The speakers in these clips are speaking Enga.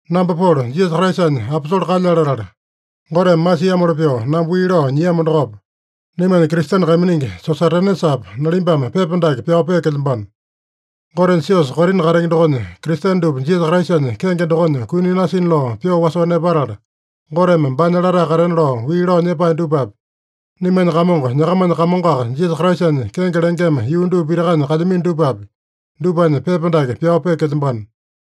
Namba Polo, Jisasa Kraisanya aposole kalyale latala, Goteme masiamoli pyoo namba wii lao nyiamo dokopa, naimanya Kristene kaiminingi Sosatenesapa, nalimbame pepa dake pyao peekelyambano. Gotenya siosa Korina katenge dokonya Kristene dupa Jisasa Kraisanya kenge dokonya kuni nasina lao pyoo wasoo nepatala, Goteme baanya latae katena lao wii lao nyepae dupapi, naimanya Kamongo, nyakamanya Kamongoaka, Jisasa Kraisanya kenge lengema yuu dupa pitakanya kalyamino dupapi, dupanya pepa dake pyao peekelyambano.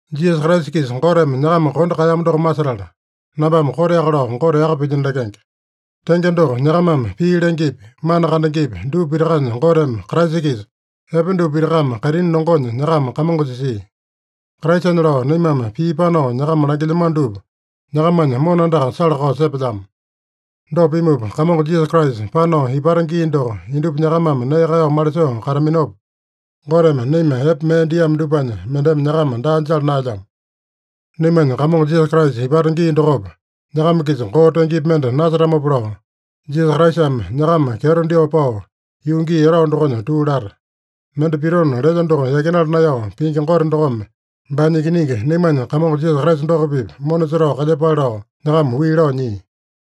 Jisasa Kraisa-kisa Goteme nyakama kondo kaeyamo doko masetala, nambame koteaka lao Gote yaka pilyino lekenge. Tenge doko, nyakamame pii lengepi, mana kandengepi, dupa pitakanya Goteme Kraisa-kisa epe dupa pitakame kaitini longonya nyakama kamongo jisia. Kraisanya lao naimame pii panao nyakama langilyamano dupa nyakamanya mona andaka sala-kao sepelyamo. Dopa pimupa, Kamongo Jisasa Kraisa panao ipata gii doko, indupa nyakamame nee kaeyao malisoo kataminopa, Goteme naima epe mee diamo dupanya mendeme nyakama daa jala naelyamo. Naimanya Kamongo Jisasa Kraisa ipata gii dokopa, nyakama-kisa koo tengepi mende nasetamopa lao, Jisasa Kraisame nyakama kyeto dyoo pao, yuu gii etao dokonya tuu lata. Mende pitona lelya doko yakinala naeyao pingi Gote dokome baanya Ikiningi, naimanya Kamongo Jisasa Kraisa doko-pipa mona setao kalyepale lao nyakama wii lao nyia.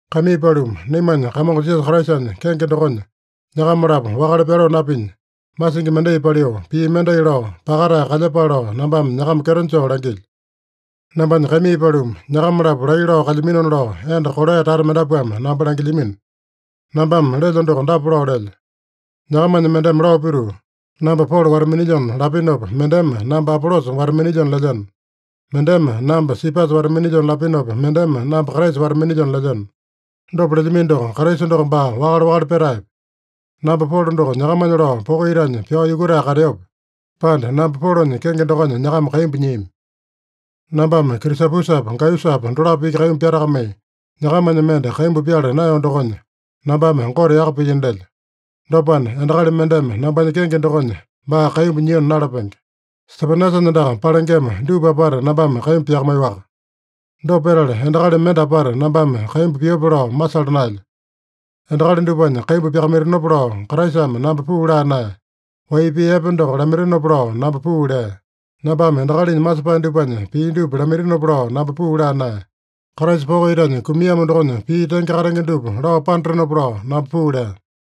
Kaimii paluma, naimanya Kamongo Jisasa Kraisanya kenge dokonya, nyakama-lapo wakale pyaloo napinya, masingi mendai paliu, pii mendai lao, pakatae kalyepale lao nambame nyakama kyeto joo langilyo. Nambanya kaimii paluma, nyakama-lapo laiya lao kalyaminona lao enda Koloe tata mendapuame namba langilyamino. Nambame lelyo doko dapa lao lelyo: Nyakamanya mendeme lao pituu, “Namba Polo wata-minilyona” lapinopa, mendeme “Namba Apolosa wata-minilyona” lelyeno. Mendeme “Namba Sipasa wata-minilyona” lapinopa, mendeme “Namba Kraisa wata-minilyona” lelyeno. Dopa lelyamino doko, Kraisa doko baa wakale-wakale petaepe? Namba Polo doko nyakamanya lao poko itanya pyao yukutae kateope, pande namba Polonya kenge dokonya nyakama kaimbu nyiami? Nambame Krisapusapa, Gaiyusapa dolapo iki kaimbu pyatakamai, nyakamanya mende kaimbu pyala naeyo dokonya, nambame Gote yaka pilyino lelyo. Dopana, endakali mendeme nambanya kenge dokonya baa kaimbu nyiona nalapenge. (Stepanasanya andaka palengema dupa apata nambame kaimbu pyakamaiyoaka. Dopa petala, endakali mende apata nambame kaimbu piope lao masala naelyo.) Endakali dupanya kaimbu pyakamaitinopa lao Kraisame namba puu laa naeya. Wai pii epe doko lamaitinopa lao namba puu lea. Nambame endakalinya masepae dupanya pii dupa lamaitinopa lao namba puu laa naeya. Kraisa poko itanya kumiamo dokonya pii tenge katenge dupa lao panatenopa lao namba puu lea.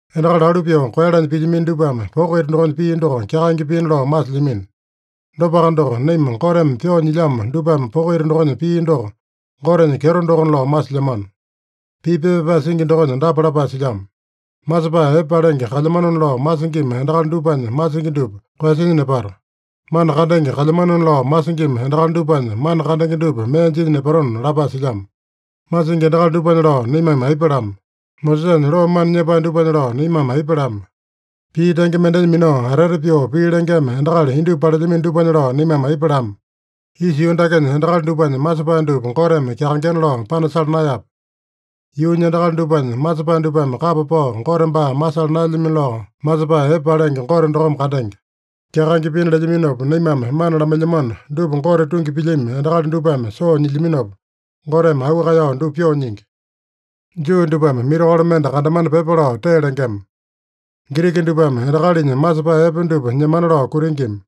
Endakali alu pyoo koeyalanya pilyamino dupame poko ita dokonya pii doko kyakaenge piina lao masilyamino. Dopaka doko, naima Goteme pyoo nyilyamo dupame poko ita dokonya pii doko Gotenya kyeto dokona lao masilyamano. Pii pepa pyapae singi dokonya dapa lapae silyamo: “Masepae epe palenge kalyamanona lao masingima endakali dupanya masingi dupa koeyasinya nepato. Mana kandenge kalyamanona lao masingima endakali dupanya mana kandenge dupa mee jinya nepatona” lapae silyamo. Masingi endakali dupanya lao naimame aipa lama? Mosesanya loo mana nyepae dupanya lao naimame aipa lama? Pii tenge mendenya minao atete pyoo pii lengema endakali indupa palelyamino dupanya lao naimame aipa lama? Isa yuu dakenya endakali dupanya masepae dupa Goteme kyakaengena lao panasala naeyape? Yuunya endakali dupanya masepae dupame kapa pao Gote baa masala naelyamino lao, masepae epe palenge Gote dokome kandenge. Kyakaenge piina lelyaminopa naimame mana lamailyamano dupa Gote tungi pilyami endakali dupame soo nyilyaminopa, Goteme auu kaeyao dupa pyoo nyingi. Juu dupame mirakolo mende kandamana pyepa lao tee lengema. Giriki dupame endakalinya masepae epe dupa nyemana lao kutingima.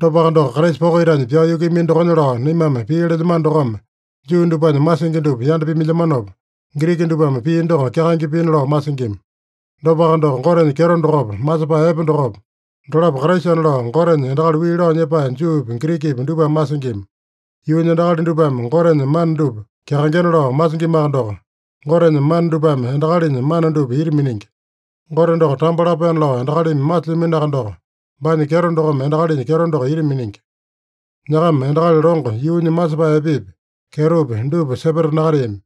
Dopaka doko, Kraisa poko itanya pyao yukuiyamino dokonya lao naimame pii lelyamano dokome, Juu dupanya masingi dupa yanda pimailyamopa, Giriki dupame pii doko kyakaenge piina lao masingima. Dopaka doko, Gotenya kyeto dokopa, masepae epe dokopa, dolapo Kraisana lao Goteme endakali wii lao nyepae Juupi, Girikipi dupame masingima. Yuunya endakali dupame Gotenya mana dupa kyakaengena lao masingimaka doko, Gotenya mana dupame endakalinya mana dupa ita miningi. Gote doko tambo lapaena lao endakalimi masilyaminoaka doko, baanya kyeto dokome endakalinya kyeto doko ita miningi. Nyakama endakali longo, yuunya masepae epepi, kyetopi dupa sepeta nakateami.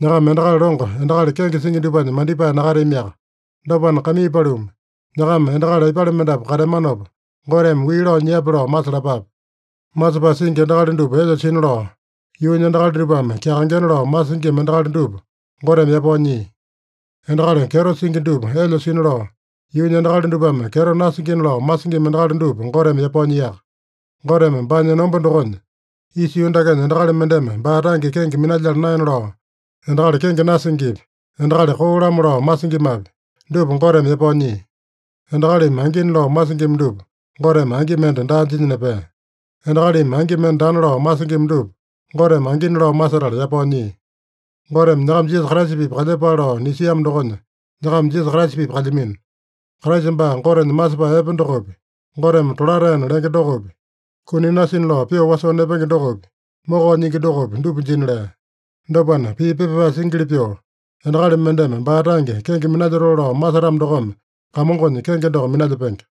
Nyakama endakali longo, endakali kenge singi dupanya mandipae nakateamiaka. Dopana, kaimii paluma, nyakama endakali aipale mendapu kateamanopa, Goteme wii lao nyiape lao masalapape. Masepae singi endakali dupa elya sina lao, yuunya endakali dupame kyakaengena lao masingima endakali dupa Goteme yapao nyia. Endakali kyeto singi dupa elya sina lao, yuunya endakali dupame kyeto nasingina lao masingima endakali dupa Goteme yapao nyiaka. Goteme baanya enomba dokonya, isa yuu dakenya endakali mendeme baa tange kenge minalyala naena lao, endakali kenge nasingipi, endakali koo-lamo lao masingimapi, dupa Goteme yapao nyia. Endakalimi angina lao masingima dupa Goteme angi mende daa jinya nepea. Endakalimi angi mende daana lao masingima dupa Goteme angina lao masetala yapao nyia. Goteme nyakama Jisasa Kraisa-pipa kalyepale lao nisiamo dokonya, nyakama Jisasa Kraisa-pipa kalyamino. Kraisa baa Gotenya masepae epe dokopi, Goteme tolataena lenge dokopi, kuni nasina lao pyoo wasoo nepenge dokopi, mokao nyingi dokopi, dupa jina lea. Dopana, pii pepa pyapae singili pyoo, “Endakali mendeme baa tange kenge minalyotoo lao masetamo dokome Kamongonya kenge doko minalyepenge.”